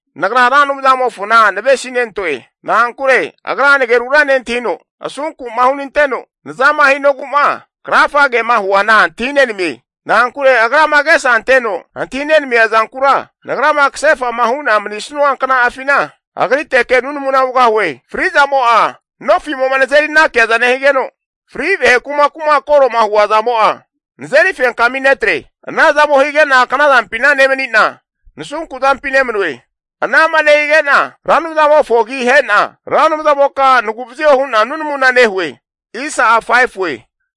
Nagra Ra Anumzamofona navesinentoe. Na'ankure Agra nagerura nentahino asunku'ma hunanteno nazama hinogu'ma krafa kema huana antahinenamie. Na'ankure Agrama agesa anteno antahi nenamia zankura, nagrama kasefa'ma hu'na manisanua kna'afina agriteke nunamuna hugahue. Fri'zamo'a nofimo'ma nazeri anakiaza nehigeno, fri vahe kumaku'ma koro huazamo'a, nazeri fenkami netre. Ana zamo hige'na knazampi nemani'na nasu zampi nemanue. Ana'ma nehige'na Ra Anumzamofo agi ahe'na, Ra Anumzamoka nagu'vazio hu'na nunamuna nehue.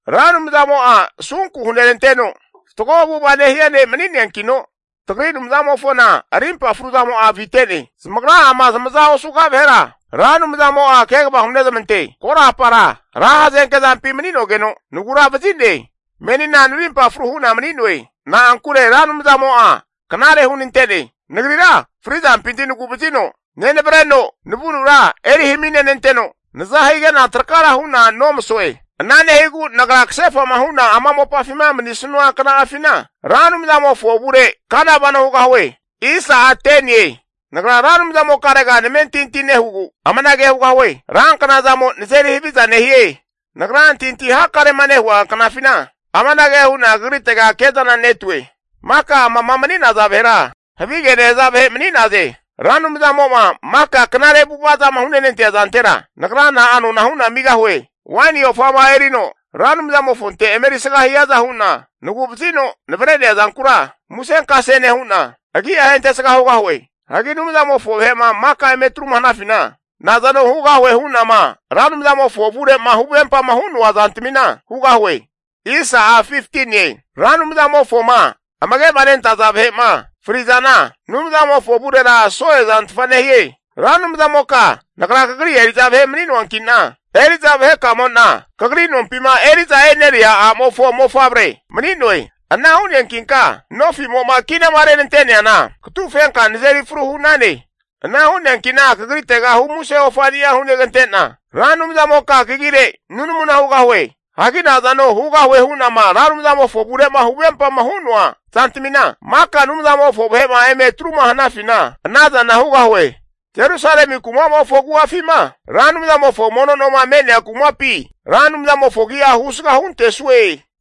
Ra Anumzamo'a asunku huneranteno, fatgo avu'ava nehia ne' mani'neankino, tagri Anumzamofona arimpa fruzamo'a avite'ne. Zamagra'ama zamaza osuga vahera, Ra Anumzamo'a kegava hunezmante. Korapara ra hazenkezampi mani'nogeno naguravazi'ne. Menina narimpa fru hu'na mani'noe. Na'ankure Ra Anumzamo'a knare hunante'ne. Nagrira fri'zampinti nagu'vazino nenavreno, navunura eri haminenanteno, naza hige'na trakara hu'na nomasoe. Ana nehigu nagra kasefa'ma hu'na ama mopafima manisanua kna'afina, Ra Anumzamofo avure kana vano hugahue. Nagra Ra Anumzamokare namentinti nehugu amanage hugahue. Ranknazamo nazeri haviza nehie. Nagra antahintahi hakarema nehua knafina amanage hu'na Kagritega kezana netue. Maka amama mani'naza vahera havige nehaza vahe mani'naze. Ra Anumzamo'ma maka knare avu'ava zama hunante'nea zantera, nagra na'a nona hu'na amigahue? Waini ofama erino Ra Anumzamofonte emerisga hiaza hu'na nagu'vazino navre'nea zankura musenkase nehu'na, agi'a ahentesga hugahue. Hagi Anumzamofo vahe'ma maka eme etruma hanafina, nazano hugahue hu'nama Ra Anumzamofo avure'ma huvempama hu'noa zantamina hugahue. Ra Anumzamofoma amage'manentaza vahe'ma frizana, Anumzamofo avurera so'e zantfa nehie. Ra Anumzamoka nagra kagri eri'za vahe mani'noanki'na, eri'za vahekamo'na kagri nompima eri'za e'neria a'mofo mofavre mani'noe. Ana hu'neankinka nofimo'ma kinama renante'neana katufenka nazeri fru hu'nane. Ana hu'neanki'na kagritega humuse ofani'a hunegante'na, Ra Anumzamoka kagire nunamuna hugahue. Hagi nazano hugahue hu'nama Ra Anumzamofo avure'ma huvempama hu'noa zantamina, maka Anumzamofo vahe'ma eme etruma hanafina ana zana hugahue. Jerusalemi kuma'mofo agu'afima, Ra Anumzamofo mono noma me'nea kumapi, Ra Anumzamofo agi'a husga huntesue.